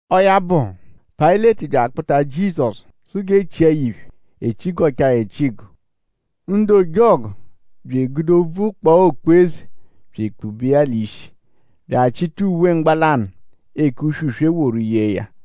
Ọo ya bụ; Payịleti bya akpụta Jizọsu sụ g'e chia ya iphe. E chigọchaa ya echigọ. Ndu ojọgu bya egude obvu kpaa okpu-eze bya ekpube iya l'ishi bya achịta uwe mgbalanụ, eke uswe-uswe woru yee ya.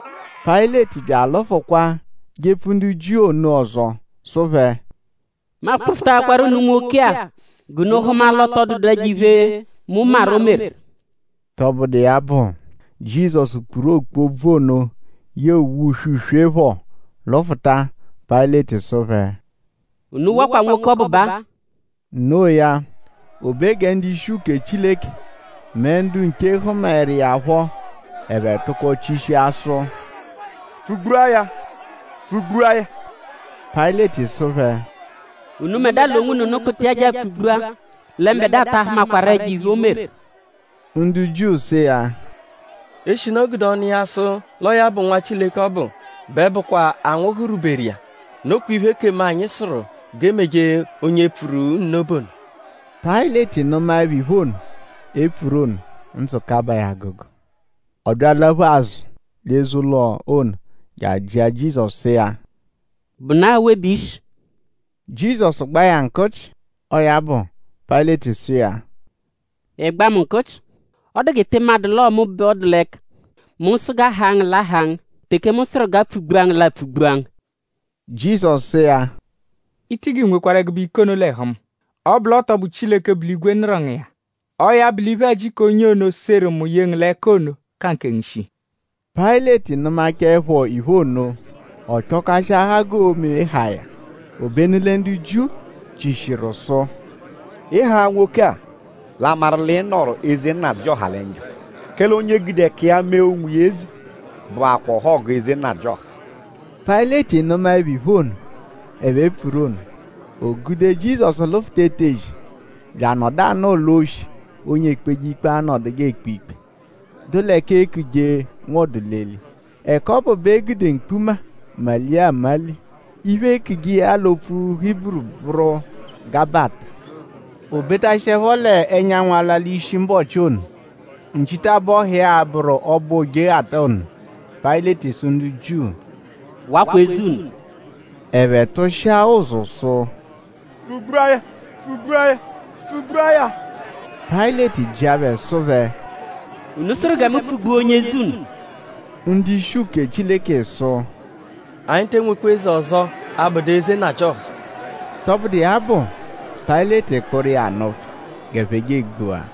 Payịleti bya alụfukwa jepfu ndu Jiu ono ọzo sụ phẹ: “Mu akpụfutaakwaru unu nwoke-a g'unu hụma l'ọ tọ dụdu ẹjo-iphe, mu maru, o meru.” Tọbudu iya bụ; Jizọsu kpuru okpu obvu ono yee uwe uswe-uswe phọ lụfuta. Payịleti sụ phẹ: “Unu wakwa nwoke ọbu baa.” Noo ya; o be gẹ ndu-ishi uke Chileke mẹ ndu nche hụmaeru iya phọ; ẹphe tụko chishia sụ: “Pfụ-gbua ya! Pfụ-gbua ya!” Payịleti sụ phẹ: “Unubẹdua l'onwunu kpụta iya je apfụ-gbua; lẹ mbẹdua ta ahụmakwaru ẹjo-iphe, o meru.” Ndu Jiu sụ iya: “Eshinu o gude ọnu iya sụ l'ọo ya bụ Nwa Chileke ọbu; bẹ bụkwa anwụhu rwuberu iya. Nokwa iphe, ekemu anyi sụru g'e meje onye pfuru nno bụ ono.” Payịleti nụmaepho iphe ono, e pfuru ono; ndzụ kabaa ya agụgu. Ọ bya alaphu azụ l'eze-ụlo ono je ajịa Jizọsu sụ iya: “?Bụnaa awe bẹ i shi?” Jizọsu gbaa ya nkụchi. Ọo ya bụ; Payịleti sụ iya: “?Ịigba mu nkụchi??Ọ dụ g'ị tị madụ l'ọo mu bẹ ọ dụ l'ẹka? Mu -sụ g'a haa ngu; l'a haa ngu; teke mu sụru g'a pfụ-gbua ngu; l'apfụ-gbua ngu.” Jizọsu sụ iya: “I tigi nwekwarụ ẹgube ike ono l'ẹhu mu; ọ -bụ l'ọ tọ bụ Chileke, bu l'igwe nụru ngu iya. Ọo ya bụ l'iphe-ẹji k'onye ono, seru mu ye ngu l'ẹka ono ka nkengu shii.” Payịleti nụmachaepho iphe ono; ọ chọkashiahaa g'oo-me haa ya. Obenu lẹ ndu Jiu chishiru sụ: “Ị -haa nwoke-a; l'a maru l'ị nọru eze nnajịoha lẹ njọ; kẹle onye, gude ẹka iya mee onwiya eze bụakwaa ọhogu eze nnajịoha.” Payịleti nụmaepho iphe ono, ẹphe pfuru ono; o gude Jizọsu lụfuta etezi bya anọdu anọo l'oshi, onye ekpeje ikpe anọduje ekpe ikpe, dụ l'ẹka eekuje Nwọdu-l'eli. Ẹka ọbu bẹ e gude mkpuma nmalia anmali. Iphe, eekuje iya l'opfu Hiburu bụru Gabata. O betashiẹpho l'ẹnyanwu alwa l'ishi mbọchi ono, nchitabọhu iya a-bụru ọbo Ojeghata ono; Payịleti sụ ndu Jiu: “Wakwa eze unu.” Ẹphe tụshia ụzu sụ: “Pfụ-gbua ya! Pfụ-gbua ya! Pfụ-gbua ya!” Payịleti jịa phẹ sụ phẹ: “?Unu sụru gẹ mu pfụ-gbua onye eze unu?” Ndu-ishi uke Chileke sụ: “Anyi te enwekwa eze ọzo; abụdu eze nnajịoha.” Tọbudu iya bụ; Payịleti kpụru iya nụ phẹ g'ẹphe je apfụ-gbua.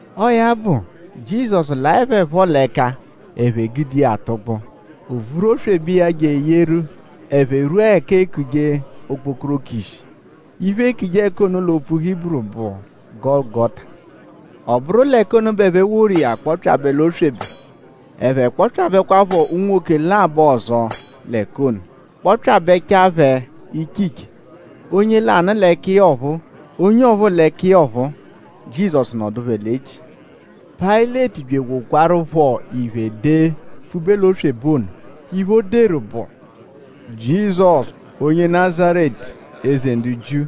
Ọo ya bụ; Jizọsu laẹ phẹ phọ l'ẹka; ẹphe gude iya tụgbua. O vuru oswebe iya je eyeru; ẹphe rwua l'ẹka eekuje Okpokoroko ishi. Iphe, eekuje ẹka ono l'opfu Hiburu bụ Gọlugota. Ọ bụru l'ẹka ono bẹ ẹphe woru iya kpọpyabe l'oswebe. Ẹphe kpọpyabekwapho unwoke labọ ọzo l'ẹka ono; kpọpyabechaa phẹ iche iche. Onye lanụ l'ẹka iya ọphuu; onye ọphuu l'ẹka iya ọphuu. Jizọsu nọdu phẹ l'echi. Payịleti bya ewokwarụpho iphe dee pfube l'oswebe ono. Iphe, o deru bụ: “JIZỌSU, ONYE NAZARETU; EZE NDU JIU.”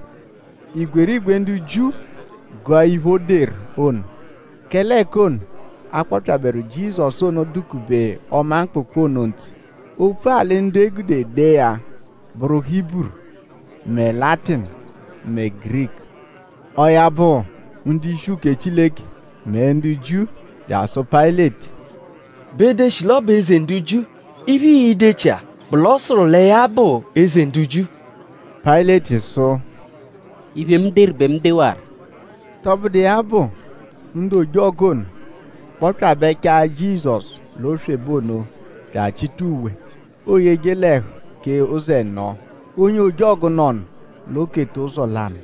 Igwerigwe ndu Jiu gụa iphe ono, o deru ono; kẹle ẹka ọbu, a kpọpyaberu Jizọsu ọbu dụ-kube ọma mkpụkpu ono ntse. Opfu-alị ndu e gude dee ya bụru Hiburu; mẹ Latinu; mẹ Giriku. Ọo ya bụ; ndu-ishi uke Chileke mẹ ndu Jiu bya asụ Payịleti: “Be deshi l'ọ bụ ‘Eze ndu Jiu’. Iphe, ii-dechia bụ ‘l'ọ sụru lẹ ya bụ Eze ndu Jiu’.” Payịleti sụ: “Iphe, mu deru bẹ mu dewaru.” Tọbudu iya bụ; ndu ojọgu ono kpọpyabechaa Jizọsu l'oswebe ono bya achịta uwe, ooyeje l'ẹhu kee ụzo ẹno. Onye ojọgu nọnu; l'o keta ụzo lanụ.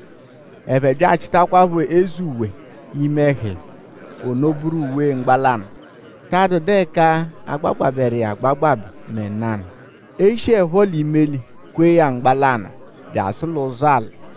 Ẹphe bya achịtakwapho eze uwe ime ẹhu iya. Ono bụru uwe mgbalanụ, ta adụdu ẹka a gbagbabẹru iya agbagbabẹ mẹ nanụ. E shiẹpho l'imeli kwee ya mgbalanụ bya asụ l'ụzo alị.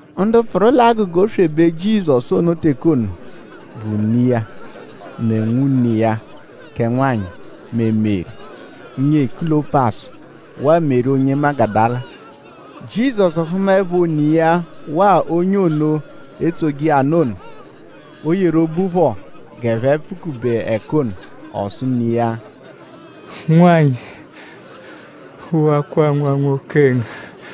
Ndu pfụru l'agụga oswebe Jizọsu ono teke ono bụ ne iya; mẹ nwune ne iya kẹ nwanyị; mẹ Meri, nyee Kulọpasu; waa Meri onye Magudala. Jizọsu hụmaepho ne iya waa onye ono, etsoje iya nụ ono, o yeru obu phọ g'ẹphe pfukube ẹka ono; ọ sụ ne iya: “Nwanyị; wakwa nwa nwoke ngu.”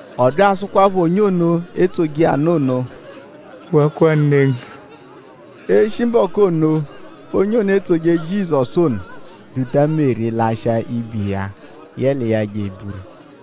Ọ bya asụkwapho onye ono, etsoje iya nụ ono: “Wakwa ne ngu.” Eshi mbọku ono; onye ono, etsoje Jizọsu ono duta Meri lashịa ibe iya yẹ l'iya je eburu.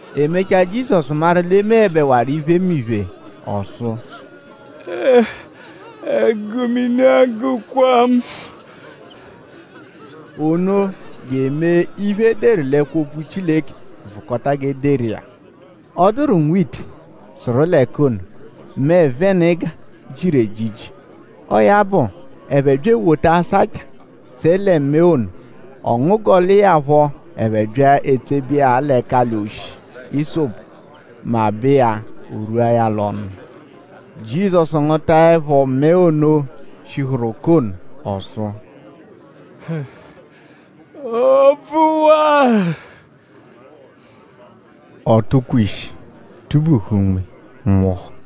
E mechaa; Jizọsu maru l'e meẹbewaru iphemiphe ọ sụ: “Ẹgu mini agụkwa mu!” Ono je emee iphe, e deru l'ẹkwo-opfu Chileke vụkota g'e deru iya. Ọ dụru nwa ite, sụru l'ẹka ono, mẹe-venịga, jiru ejiji. Ọo ya bụ; ẹphe bya ewota asancha tsẹe lẹ mẹe ono. Ọ ngụguel'iya phọ; ẹphe bya etsebe iya l'ẹkali-oshi ịsopu; mabẹ iya o rwua ya l'ọnu. Jizọsu ngụtaepho mẹe ono, shihuru ụka ono ọ sụ: “Ọ bvụwaru.” Ọ tụkwe ishi; tụ-buhu unme; nwụhu.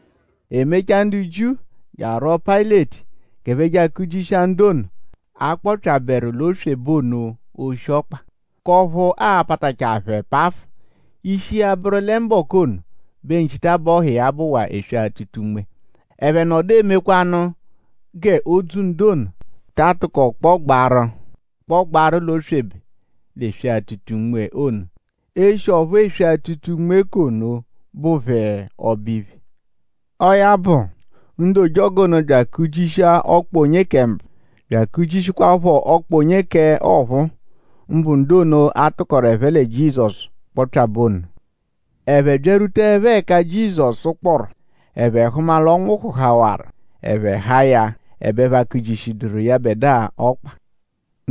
E mechaa; ndu Jiu je arwọo Payịleti g'ẹphe je akụ-jishia ndu ono, a kpọpyaberu l'oswebe ono oshi-ọkpa; k'ọphu aa-patachaa phẹ pafụ. Ishi iya bụru lẹ mbọku ono bẹ nchitabọhu iya bụwaa eswe-atụta-unme. Ẹphe nọdu emekwanụ g'odzu ndu ono ta atụko kpọgbaaru l'oswebe l'eswe-atụta-unme ono eshi ọphu eswe-atụta-unme k'ono bụ phẹ ọbo-iphe. Ọo ya bụ; ndu ojọgu ono bya akụ-jishia ọkpa onye kẹ mbụ; bya akụ-jishikwaaphọ ọkpa onye ọphuu; mbụ ndu ono, a tụkoru ẹphe lẹ Jizọsu kpọpyabe ono. Ẹphe byarwutaẹpho ẹka Jizọsu kpọru; ẹphe hụma l'ọ nwụhuhawaru; ẹphe haa ya; ẹbe ẹphe akụ-jishiẹduru yẹbedua ọkpa.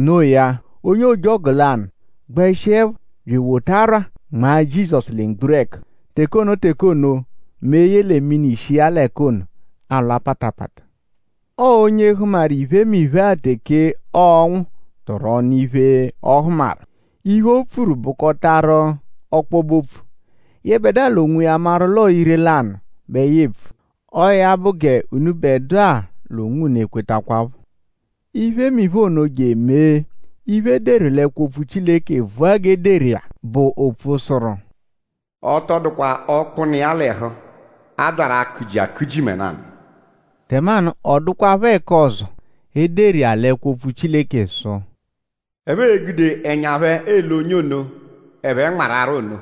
No iya; onye ojọgu lanụ gbẹshiepho bya ewota arwa nmaa Jizọsu lẹ mgburẹku. Teke ono teke ono; mee yẹle mini shi iya l'ẹka ono alwa patapata. Ọo onye hụmaru iphemiphe-a teke ọonwu tụru ọnu iphe, ọ hụmaru. Iphe, o pfuru tụkoru bụkotaru ọkpobe-opfu. Yẹbedua l'onwiya maru l'ọo ire-lanụ bẹ ya epfu. Ọo ya bụ g'unubẹdua l'onwunu ekwetakwaphọ. Iphemiphe ono je emee iphe, e deru l'ẹkwo-opfu Chileke vụa g'e deru iya, bụ ọphu sụru: “Ọ tọ dụkwa ọkpu, nọ iya l'ẹhu, a byaru akụ-ji akụ-ji mẹ nanụ.” Tẹmanu; ọ dụkwarupho ẹka ọzo, e deru iya l'ẹkwo-opfu Chileke sụ: “Ẹphe e-gude ẹnya phẹ ele onye ono, ẹphe nmarụ arwa ono.”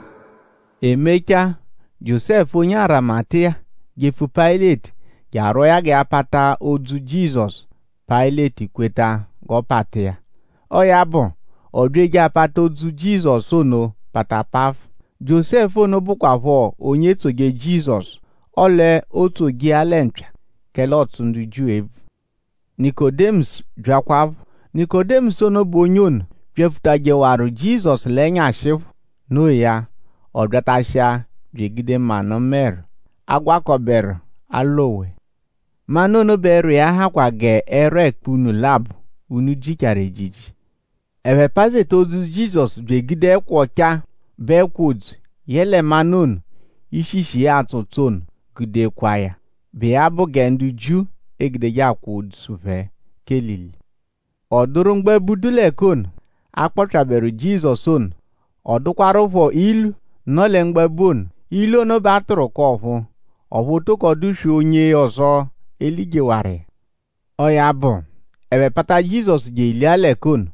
E mechaa; Jiósẹfu onye Arimatiya jepfu Payịleti je arwọo ya gẹ ya pata odzu Jizọsu. Payịleti kweta g'ọ pata iya. Ọo ya bụ; ọ bya eje apata odzu Jizọsu ono pata pafụ. Jiósẹfu ono bụkwapho onye etsoje Jizọsu; ọle ootsoje iya lẹ mpya; kẹle ọotsu ndu Jiu ebvu. Nikodimọsu byakwaphọ. Nikodimọsu ono bụ onye ono, byapfutajẹhawaru Jizọsu l'ẹnyashi phọ. No iya; ọ byatashia bya egude manụ mẹru, agwakọberu “alowe”. Manụ ono bẹ ẹrwa iya hakwa g'ẹrwa ẹkpa-únú labọ, únú jichaaru ejiji. Ẹphe pazeta odzu Jizọsu bya egude ẹkwa ọchaa, bụ ẹkwa odzu yẹle manụ ono, ishishi iya atsọ ụtso ono gude kwaa ya, bụ iya bụ gẹ ndu Jiu egudeje akwa odzu phẹ k'elili. Ọ dụru mgbabu, dụ l'ẹka ono, a kpọpyaberu Jizọsu ono. Ọ dụkwarupho ilu, nọ lẹ mgbabu ono. Ilu ono bẹ a tụru k'ọ̀phúú; ọphu o toko dụ-swee onye ọzo, e lijehawaru iya. Ọo ya bụ; ẹphe pata Jizọsu je elia l'ẹka ono;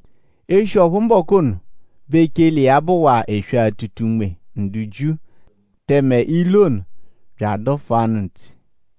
eshi ọphu mbọku ono bẹ echele iya bụwaa eswe-atụta-unme ndu Jiu; tẹme ilu ono bya adụfuanu ntse.